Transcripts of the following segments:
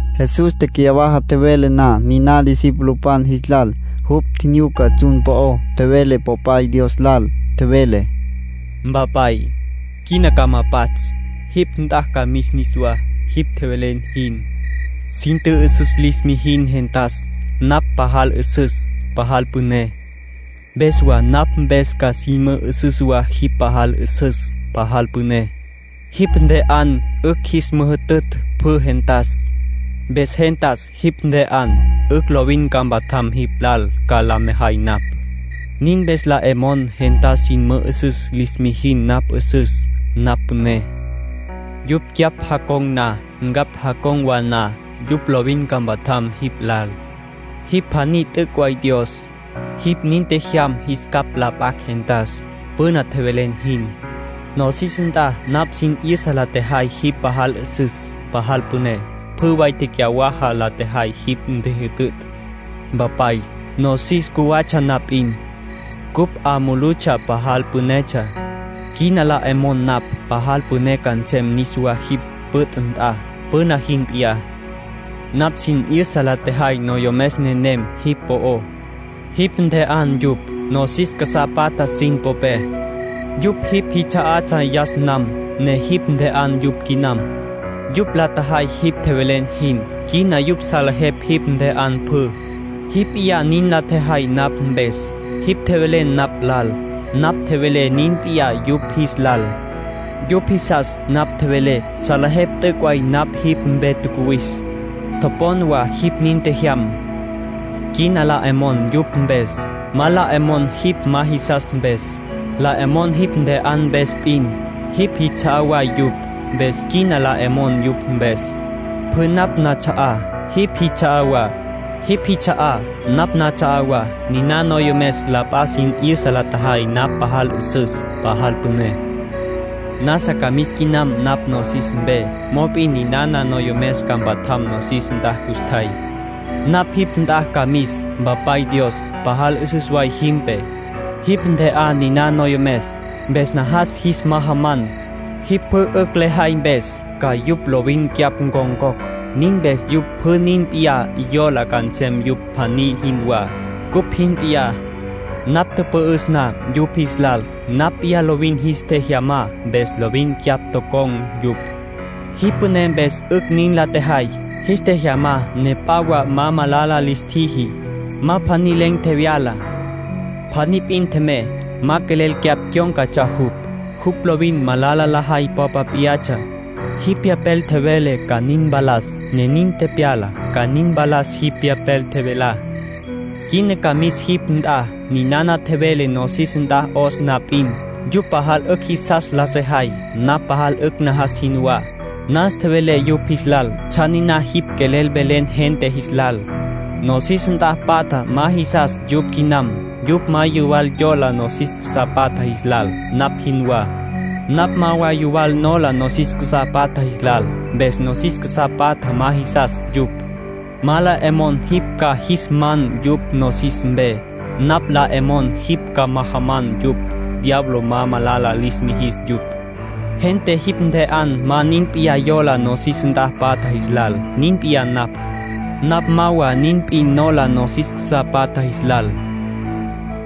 Jesús tecyawaja tjevele na niná discipulopan jis lal, jupj tjinyuca tsjun po'ó, tjevele Popay Dios lal. Tjevele: “Mpapay, quina ca ma pats'. Jipj nt'a ca mis niswá, jipj tjevelen jin. Sin tjü'üsüs lis mijin gentas napj pajal 'üsüs, pajal püné. Mpes wa napj mpes ca sin mü'üsüs wa jipj pajal 'üsüs, pajal püné. Jipj ntje'an 'ücj jis müjütütj pjü gentas. Mpes gente jipj ntje'an 'ücj lovin ca mpatjam jipj lal ca la mejay napj. Nin mpes la 'e mon gente sin mü'üsüs lis mijin napj 'üsüs, napj püné. Yupj cyapj jacon̈ na, ncapj jacon̈ wa na, yupj lovin ca mpatjam jipj lal. Jipj pjaní t'üc' way Dios. Jipj nin tjejyam jis capj la p'acj gentas, püna tjevelen jin. ”Nosis nt'a napj sin 'yüsa la tjejay jipj pajal 'üsüs, pajal püné. Pjü way tecyawaja la tjejay jipj ntjijütütj. Mpapay, nosis cjuwatsja na p'in, cupj 'a mulutsja pajal pünetsja. Quina la 'e mon napj pajal püné ca nsem niswá jipj püt' nt'a, püna jin p'iyá. ”Napj sin 'yüsa la tjejay noyomes nenem jipj po'ó. Jipj ntje'an yupj, nosis casá patja sin popé. Yupj jipj jits'a'atsja yas nam, ne jipj ntje'an yupj quinam. Yupj la tjajay jipj tjevelen jin. Quina yupj salejepj jipj ntje'an pjü. Jipj p'iyá nin la tjejay napj mpes. Jipj tjevelen napj lal, napj tjevelé nin p'iyá yupj jis lal. Yupj jisas napj tjevelé. Salejepj t'üc' way napj jipj mpe tjacuwis. Topon wa jipj nin tjejyam. ”Quina la 'e mon yupj mpes. Ma la 'e mon jipj ma jisas mpes. La 'e mon jipj ntje'an mpes p'in. Jipj jits'a'á way yupj, mpes quina la 'e mon yupj mpes. Pjü napj nats'a'á, jipj jits'a'á wa; jipj jits'a'á, napj nats'a'á wa. Niná noyomes la p'a sin 'yüsa la tjajay napj pajal 'üsüs, pajal püné. ”Nasa ca mis quinam napj nosis mpe. Mop'in ninana noyomes ca mpatjam nosis nt'a custjay. Napj jipj nt'a ca mis. Mpapay Dios, pajal 'üsüs way jimpe. Jipj ntje'an niná noyomes. Mpes najas jis majaman, jipj pjü 'ücj lejay mpes, ca yupj lovin cyapj ncon̈cocj. Nin mpes yupj pjü nin p'in yola ca nsem yom pjaní jinwá, cupj jin p'iyá. Napj tüpü'üs na yupj jis lal, napj p'iyá lovin jis tjejyamá, mpes lovin cyapj tocon̈ yupj. Jipj püné mpes 'ücj nin la tjejay. Jis tjejyamá ne p'a wa ma malala lis tjiji. Ma pjaní len̈ tjevyala. Pjaní p'in tjemey. Ma quelel cyapj cyón̈catsja jupj. Jupj lovin malala lajay popa p'iyatsja. Jipj Pyapel tjevele ca nin mpalas, ne nin tepyala, ca nin mpalas jipj Pyapel tjevelá. ”Quina ca mis jipj nt'a. Ninana tjevelé nosis nt'a 'os na p'in, yupj pajal 'ücj jisas la sejay, napj pajal 'ücj najas jinwá. Nas tjevelé yupj jis lal tsjan niná jipj quelel velen gente jis lal. Nosis nt'a patja ma jisas yupj quinam. Yupj ma yuwal yola nosis casá patja jis lal, napj jinwá. Napj ma wa yuwal nola nosis casá patja jis lal. Mpes nosis casá patja ma jisas yupj. Ma la 'e mon jipj ca jis man yupj nosis mpe. Napj la 'e mon jipj ca majaman yupj, diablo ma malala lis mijis yupj. Gente jipj ntje'an ma nin p'in yola nosis nt'a patja jis lal. Nin p'iyá napj. Napj ma wa nin p'in nola nosis casá patja jis lal.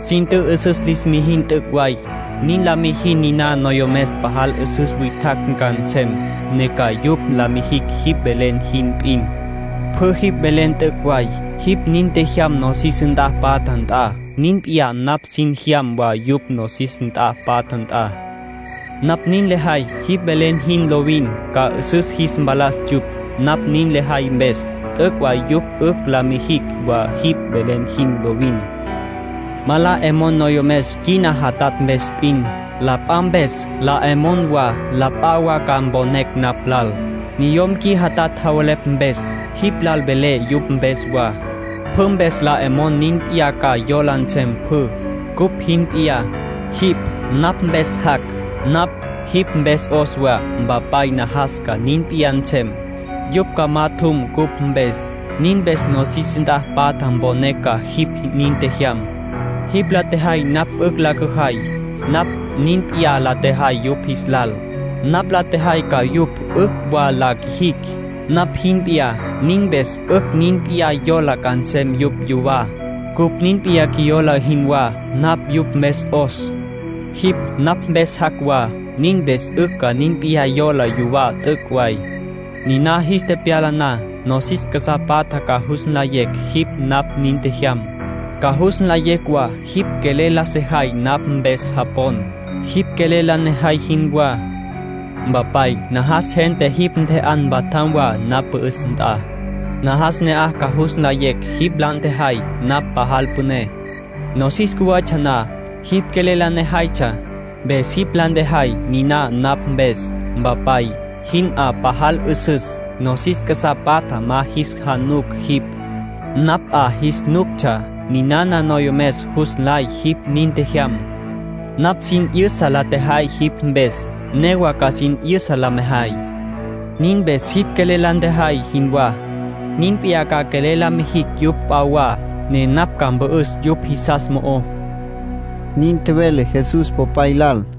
Sin tjü'üsüs lis mijin t'üc' way. Nin la mijin niná noyomes pajal 'üsüs witjacj ca nsem, ne ca yupj la mijicj jipj velen jin p'in. Pjü jipj velen t'üc' way. Jipj nin tjejyam nosis nt'a patja nt'a. Nin p'iyá napj sin tjejyam wa yupj nosis nt'a patja nt'a. Napj nin lejay jipj velen jin lovin, ca 'üsüs jis mpalas yupj. Napj nin lejay mpes, t'üc' way yupj 'ücj ca la mijicj wa jipj velen jin lovin. ”Ma la 'e mon noyomes qui jatja mpes p'in. La p'a mpes 'a le mon wa. La p'a wa ca mponecj napj lal, niyom qui jatja javelepj mpes. Jipj lal velé yupj mpes wa. Pjü mpes la 'e mon nin p'iyá ca yola nsem pjü, cupj jin p'iyá. Jipj napj mpes jac'; napj jipj mpes 'os wa. Mpapay, najas ca nin p'iyá nsem, yupj ca majatjum cupj mpes. Nin mpes nosis nt'a patja mponecj ca jipj nin tjejyam. Jipj la tjejay napj 'ücj la cüjay. Napj nin p'iyá la tjejay yupj jis lal. Napj la tjejay ca yupj 'ücj wa la quijicj, napj jin p'iyá. Nin mpes 'ücj nin p'iyá yola ca nsem yupj yuwá, cupj nin p'iyá qjuiyola jinwá. Napj yupj mpes 'os; jipj napj mpes jac' wa. Nin mpes 'ücj ca nin p'iyá yola yuwá t'üc' way. Nina jis tepyala na, nosis casá patja ca jus nlayecj jipj napj nin tjejyam. Ca jus nlayecj wa jipj quelel la sejay napj mpes japon, jipj quelel la nejay jinwá. ”Mpapay najas gente jipj ntje'an mpatjam wa napj pü'üs nt'a. Najas ne'aj ca jus nlayecj jipj la ntjejay napj pajal püné. Nosis cjuwatsja na, jipj quelel la nejaytsja, mpes jipj la tjejay niná napj mpes. Mpapay, jim 'a pajal 'üsüs. Nosis casá patja ma jis januctsja jipj; napj 'a jis nuctsja. Ninana noyomes jus nlay jipj nin tjejyam. Napj sin 'yüsa la tjejay jipj mpes. Newa ca sin 'yüsa la mejay. Nin mpes jipj quelel la ntjejay jinwá, nin p'iyá ca quelel la mijicj yupj p'a wa, ne napj ca mpü'üs yupj jisas mo'ó”, nin tjevele Jesús Popay lal.